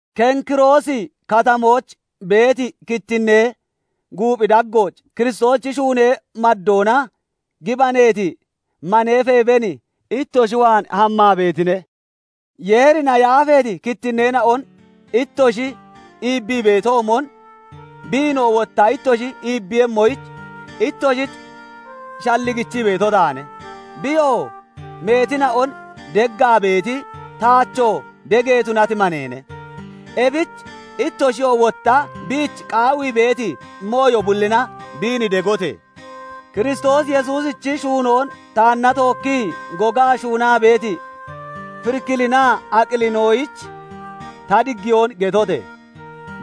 Kenkiroosi Katamooch beeti kittinnee guuphi daggooch Kiristoosichi shuunee maddoona gibaneeti manee Feeben ittoshi waan hammaa beetine. Yeerina yaafeeti kittinneena'on ittoshi iibbii beetoomon, biinoo wotta ittoshi iibbiiyemmoyich ittoshich shalligichii beeto taane. Biyoo meetina'on deggaa beeti, taachoo dege tunati maneene. Ebich ittoshiyoo wotta biich qaawii beeti mooyo bullina biin degote! Kiristoos Yesuusichi shuunoon taanna tookkii gogaa shuunaa beeti Firikilinaa Aqilinoyich ta diggiyoon getote!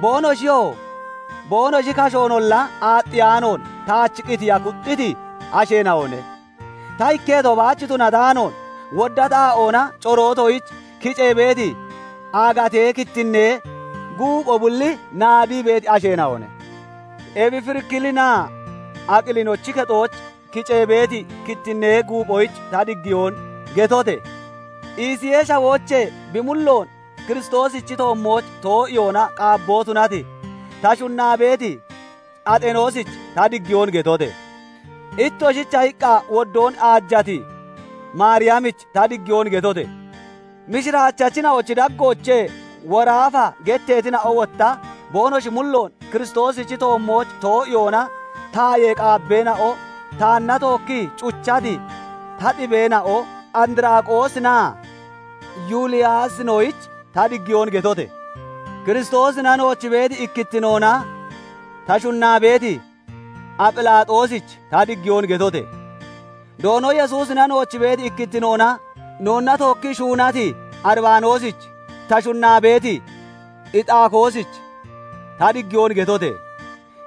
Boonoshiyoo boonoshi kashoonolla aaxxiyaanoon taach qitiya kuxxiti asheena'one; ta ikketo baach tunataanoon, wodda xaa'oona corootoyich kicee beeti aagatee kittinnee guupho bulli naadii beeti asheena'one. Ebi Firikilinaa Aqilinochi kexooch kicee beeti kittinnee guuphoyich ta diggiyoon getote! Isiyee Shawoochee bi mulloon Kiristoosichi toommooch too'iyoona qaabboo tunati, ta shunnaa beeti Axenoosich ta diggiyoon getote! Ittoshicha iqqa woddoon aajati Maariyamich ta diggiyoon getote! Mishiraachachina'ochi daggoochee "Woraafa" getteetina'o, wotta boonoshi mulloon Kiristoosichi toommooch too'iyoona tayee qaabbeena'o, taanna tookkii cuchati ta xibeena'o andraqoosinaa Yuliyaasinoyich ta diggiyoon getote! Kiristoosina nooch beeti ikkittinoona ta shunnaa beeti Aphilaaxoosich ta diggiyoon getote! Doono Yesuusina nooch beeti ikkittinoona noonna tookkii shuunati Uribaanoosich, ta shunnaa beeti Ixaakoosich ta diggiyoon getote!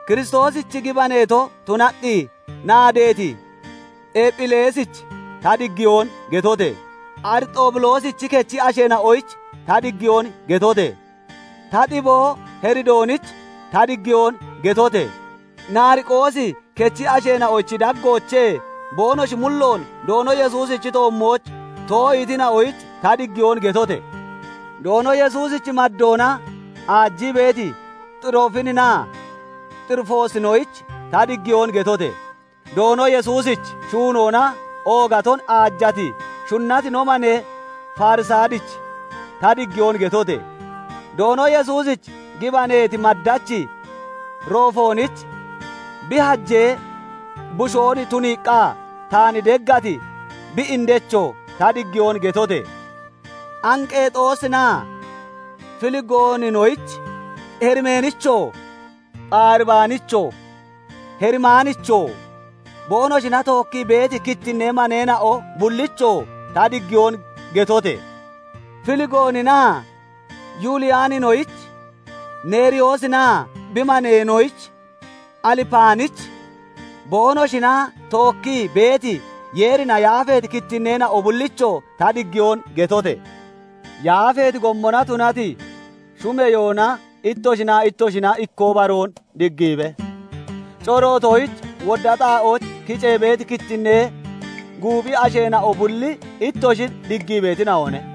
Kiristoosich gibaneeto tunaqqi naadeeti Ephileesich ta diggiyoon getote! Arixoobuloosichi kechi asheena'oyich ta diggiyoon getote! Ta xiboo Heridoonich ta diggiyoon getote! Nariqoosi kechi asheena'ochi daggoochee boonoshi mulloon Doono Yesuusichi toommooch too'iitina'oyich ta diggiyoon getote! Doono Yesuusich maddoona aajii beeti Xiroofininaa Xirifoosinoyich ta diggiyoon getote! Doono Yesuusich shuunoona oogaton aajati, shunnati no manee Farisaadich ta diggiyoon getote! Doono Yesuusich gibaneeti maddachi Roofoonich, bi hajee bushoon tuniiqqa taan deggati bi indechoo ta diggiyoon getote! Anqeexoosinaa Filigooninoyich, Herimeenichoo, Pharibaanichoo, Herimaanichoo, boonoshina tookkii beeti kittinnee maneena'o bullichoo ta diggiyoon getote! Filigooninaa Yuuliyaaninoyich, Neeriyoosinaa bi maneenoyich, Alipaanich, boonoshina tookkii beeti Yeerina yaafeeti kittinneena'o bullichoo ta diggiyoon getote! Yaafeeti gommona tunati shumeyoona ittoshinaa ittoshina ikkoo baroon diggiibe. Corootoyich wodda xaa'ooch kicee beeti kittinnee guuphi asheena'o bulli ittoshin diggii beetina'one.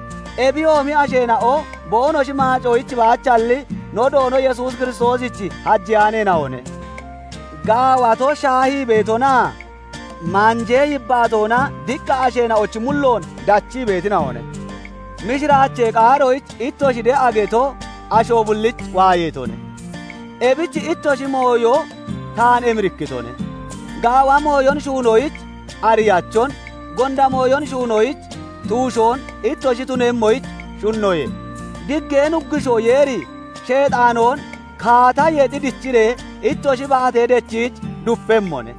Ebiyoomi asheena'o boonoshi maacoyich baachalli no Doono Yesuus Kiristoosich hajeyaaneena'one; gaawato shaahii beetonaa maanjee yibbaatoona diqqa asheena'ochi mulloon dachii beetina'one. Mishiraachee qaaroyich ittoshi de'a geto asho bullich waayeetone. Ebich ittoshi mooyo taan emirikkitone; gaawa mooyon shuunoyich ariyachon, gonda mooyon shuunoyich tuushoon ittoshi tunemmoyich shunnoye. Diggee Nuggushoo Yeeri Sheexaanoon kaata yexi dichiree ittoshi baatee dechiich dupemmone.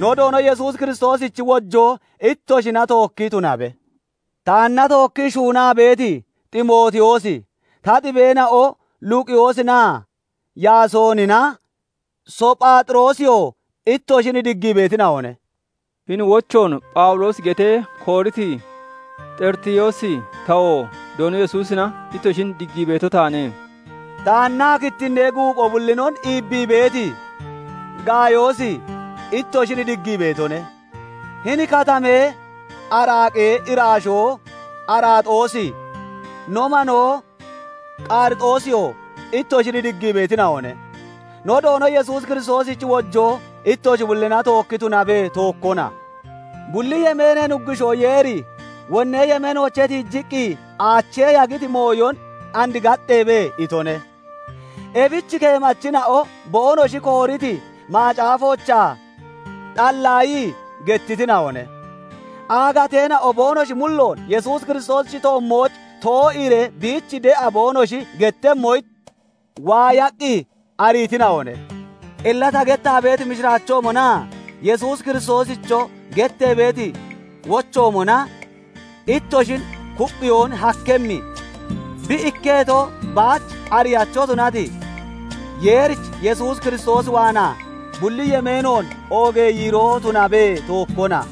No Doono Yesuus Kiristoosichi wojoo ittoshina tookki tunabe. Taanna tookkii shuunaa beeti Ximootiyoosi, ta xibeena'o Luqiyoosinaa Yaasoonina, Sophaaxiroosiyoo ittoshin diggii beetina'one. Hini wochoon Phawuloosi getee kooriti Xeritiyoosi tawoo Doono Yesuusina ittoshin diggii beeto taane. Taannaa kittinnee guupho bullinon iibbii beeti Gaayoosi ittoshin diggii beetone. Hini katamee araaqee iraashoo Araaxoosi, no manoo Qarixoosiyoo ittoshin diggii beetina'one. [ No Doono Yesuus Kiristoosichi wojoo ittoshi bullina tookki tunabe; tookkona.] Bulli yemeenee Nuggushoo Yeeri wonnee yemeenoochee tiijiqqi aachee yagiti mooyon "And gaxxeebe" itone. Ebich keemachina'o boonoshi kooriti macaafoochaa xallaayii gettitina'one; aagateena'oo boonoshi mulloon Yesuus Kiristoosichi toommooch too'iiree biich de'a boonoshi gettemmoyich waayaqqi ariitina'one. Illa ta gettaa beeti mishiraachoomonaa Yesuus Kiristoosicho gettee beeti wochoomona ittoshin kupphiyoon hakkemmi, bi ikketo baach ariyacho tunati Yeerich Yesuus Kiristoos waanaa bulli yemeenoon oogee yiiroo tunabe; tookkona.